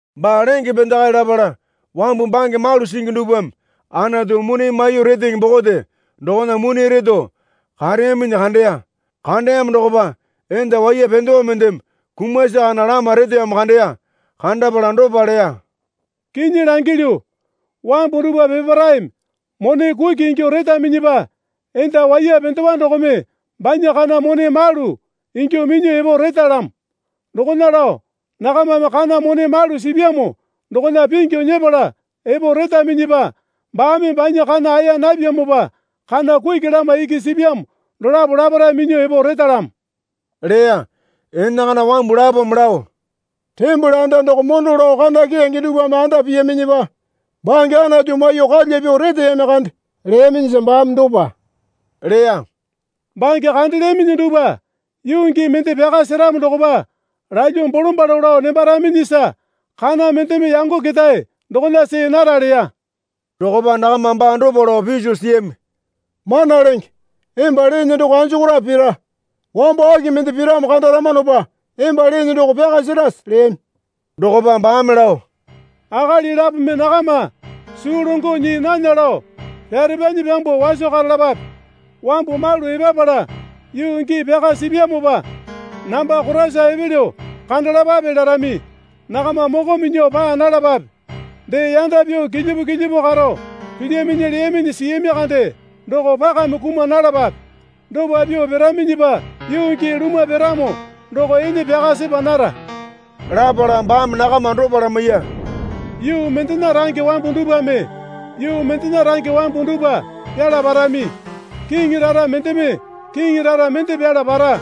Baa lenge pendakae lapala wambu bange malu singi dupwame Anatu mone maiyuo retenge bokote dokona mone reto kareyaminyi kandeya. Kandeyamo dokopa enda waiya pendewa mendeme kumasi kana lama reteyamo kandeya. Kandapala dopa leya. Kinyi langilyu, wambu dupwa peparaeme mone kuki ingyuo retaminyipa enda waiya pendewa dokome banya kana mone malu ingyuo minyuo epo retalamo. Dokona lao nakamame kana mone malu sipyamo dokona pingyu nyepala epo retaminyipa baame banya kana aeya napyamopa kana kuki lama iki sipyamo dolapo laparae minyuo epo retalamo leya. Enakana wambu lapome lao, Tembole anda doko mondo lao kana keyange dupwame anda piyaminyipa bange Anatu maiyuo kalya pyuo reteyami kande leyaminyisa baame dopa leya. Bange kandelyaminyi dupwa yuu gii mende pyaka seramo dokopa lalyuo bolombalo lao nembaraminyisa kana mendeme yango ketae dokona see nara leya. Dokopa nakama baa dopa lao piso siyami. Mana Lenge, emba leene doko anjokorape pira? Wambo aki mende piramo kandaramanopa emba leene doko pyaka serase? leyami. Dokopa baame lao, Akali lapome nakama suu longo nyii nana lao pyarepyanyi pyambuo waso karalapape. Wambu malu epapala yuu gii pyaka sipyamopa namba Koraisa epelyo kandalapape larami. Nakama moko minyuo paa nalapape. Dee, yanda pyuo kilyipu kilyipu karo pilyaminyi leyaminyi siyami kande doko pakame kuma nalapape. Dopa pyuo piraminyipa yuu gii lumwa piramo doko ene pyaka sepa nara. Lapala baame nakama dopa lamaiya. Yuu mendena range wambu dupwame yuu mendena range wambu dupwa pyala parami. Kiŋi rara mendeme kiŋi rara mende pyala para.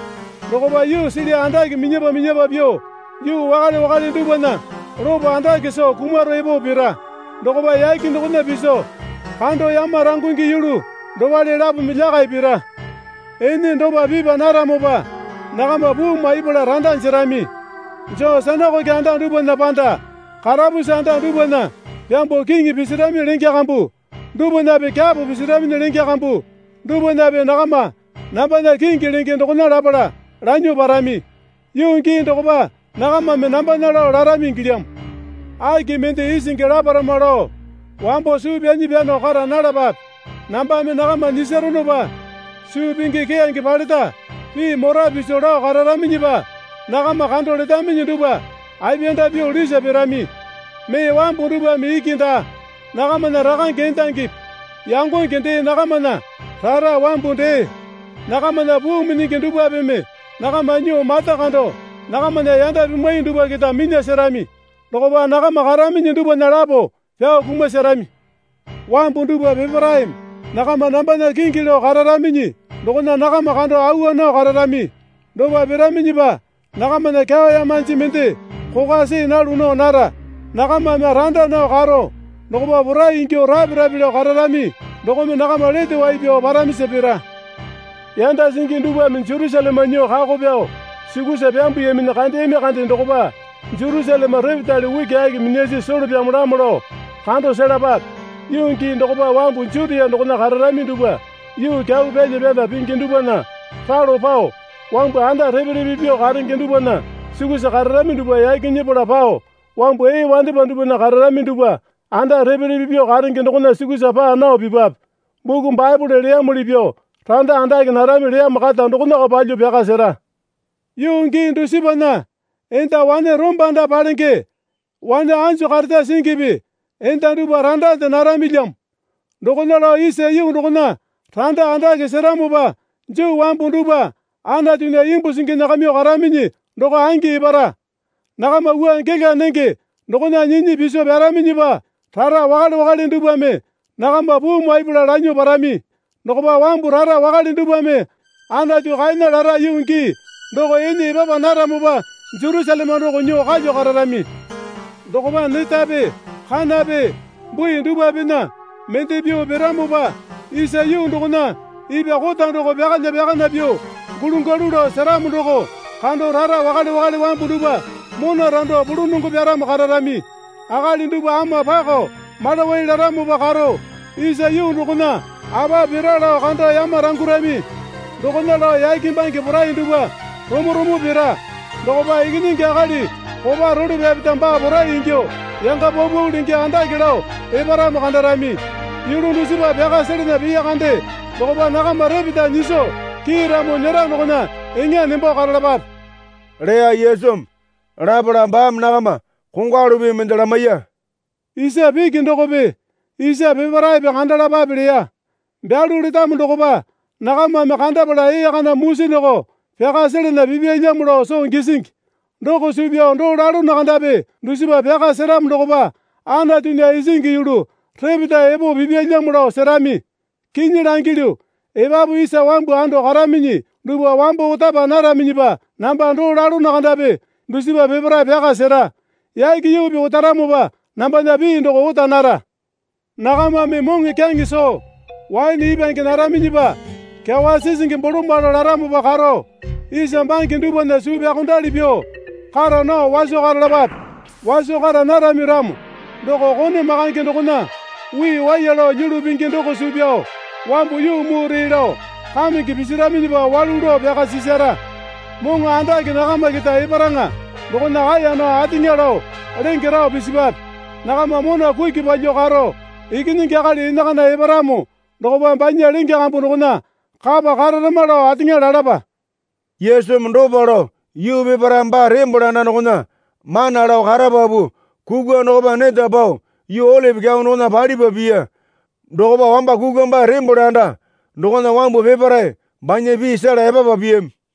Dokopa yuusili andake minyapa minyapa pyuo yuu wakale wakale dupwana lopo andake soo kumaro epo pira. Dokopa yake dokona piso kando yamarangungi yulu dopale lapome lyakai pira. Ene dopa pipa naramopa nakama puu maipala randa jerami. Joo sinakoke anda dupwana panda karapusi anda dupwana pyambuo kiŋi pisirami lenge kambu dupwanape kyapo pisirami lenge kambu dupwanape nakama nambana kingi lenge dokona lapala lanyuo parami. Yuu gii dokopa nakamame nambana lao larami ingilyamo. Aki mende isingi laparama lao wambo suu pyanyi pyano kara nalapape. Nambame nakama nyisaronopa suu pingi keyange paleta pii mora piso lao kararaminyipa nakama kando letaminyi dupwa apiyanda pyuo lisa pirami. Mee wambu dupwame iki daa, nakamana rakange endangipi yangonge dee nakamana rara wambu dee nakamana puu minyingi dupwapeme nakama nyuo mata kando nakamana yanda pimwai dupwa keta minya serami. Dokopa nakama karaminyi dupwana lapo pyao kumaserami. Wambu dupwa peparaeme nakama nambana kingi lao kararaminyi dokona nakama kando awa nao kararami. Dopa piraminyipa nakamana kyawa yamanji mende kokwa see nalu nao nara. Nakamame randa nao karo dokopa porai ingyuo rape rape lao kararami dokome nakama lete wai pyao paramisa pira. Yanda singi dupwame Jerusaleme nyuo kako pyao sukusa pyambuyaminyi kandeyami kande dokopa Jerusaleme repetale ukiaki minyasi solo pyamolamo lao kando selapape. Yuu gii dokopa wambu Jutia dokona kararami dupwa yuu kyau pyalya pyana pingi dupwana ralo pao, wambu anda repe repe pyuo karenge dupwana sukusa kararami dupwa yaki nyepala pao, wambu ee wandepa dupwana kararami dupwa anda repe repe pyuo karenge dokona sukusa paa nao pipwape. Buku Baepole leyamuli pyuo randa andake narami leyamo kata dokonako palyuo pyaka sera. Yuu gii dusipana enda wane rombanda palenge wane anjo kareta singipi enda dupwa randande naramilyamo. Dokona lao isa yuu dokona randa andake seramopa Juu wambu dupwa Anatunya imbu singi nyakamyuo karaminyi doko angi epara. Nakama wua gela nenge dokona nyinyi piso pyaraminyipa, rara wakale wakale dupwame nakama puu maipala lanyuo parami. Dokopa wambu rara wakale dupwame Anatu kaena lara yuu gii doko ene epapa naramopa Jerusaleme doko nyuo kalyuo kararami. Dokopa netape kanape bui dupwapena mende pyuo piramopa isa yuu dokona ipwa kota doko pyakalya pyakana pyuo gulu galu lao seramo doko kando rara wakale wakale wambu dupwa mona rando pulunongo pyaramo kararami. Akali dupwa ama pakao malawai laramopa karo isa yuu dokona apa pira lao kando yamarangurami. Dokona lao yake bange porai dupwa romo romo pira. Dokopa Ikinyingi Akali kopa role pyapeta baa porai ingyuo yanga paupau lenge andake lao eparamo kandarami. Yulu dusipa pyaka selana piya kande dokopa nakama repeta nyiso kiiramo nyera dokona eŋa nembo karalapape, leya Yesumi. Lapala baame nakama kongwalu pii mende lamaiya. Isa piki dokope isa peparaepe kandalapape leya. Byalu letamo dokopa nakamame kandapala ee kana musi doko pyaka selana pipyalyamo lao soo gisingi. Doko suu pyao doo lalono kandapi dusipa pyaka seramo dokopa Anatunya isingi yulu repeta epo pipyalyamo lao serami. Kinyi langilyu, epapu isa wambu ando karaminyi dupwa wambo otapa naraminyipa namba doo lalono kandapi dusipa peparae pyaka sera. Yake yuupi otaramopa nambana pii doko ota nara. Nakamame moŋokyaŋe soo waene ipwange naraminyipa kyawa sisingi bolombalo laramopa karo isa bange dupwana suu pyaokondali pyuo kara nao waso karalapape. Waso kara narami ramo doko kone makange dokona wii waiya lao lyulu pingi doko suu pyao wambu yuu mure lao kamenge pisiraminyipa walu lao pyaka sisara. Moŋo andake nakama keta eparaŋa dokona kaeya nao ateŋa lao lenge rao pisipwape. Nakama mona kuki palyuo karo Ikinyingi Akali enakana eparamo dokopa banya lenge kambu dokona kapa kararama lao ateŋa lalapa. Yesumi dopa lao yuu peparae baa tembole anda dokona mana lao karapapu kukwa dokopa neta pao yuu Olipi Kyau dokona palipa piya. Dokopa wamba kukwa baa tembole anda dokona wambu peparae banya pii sela epapa piyami.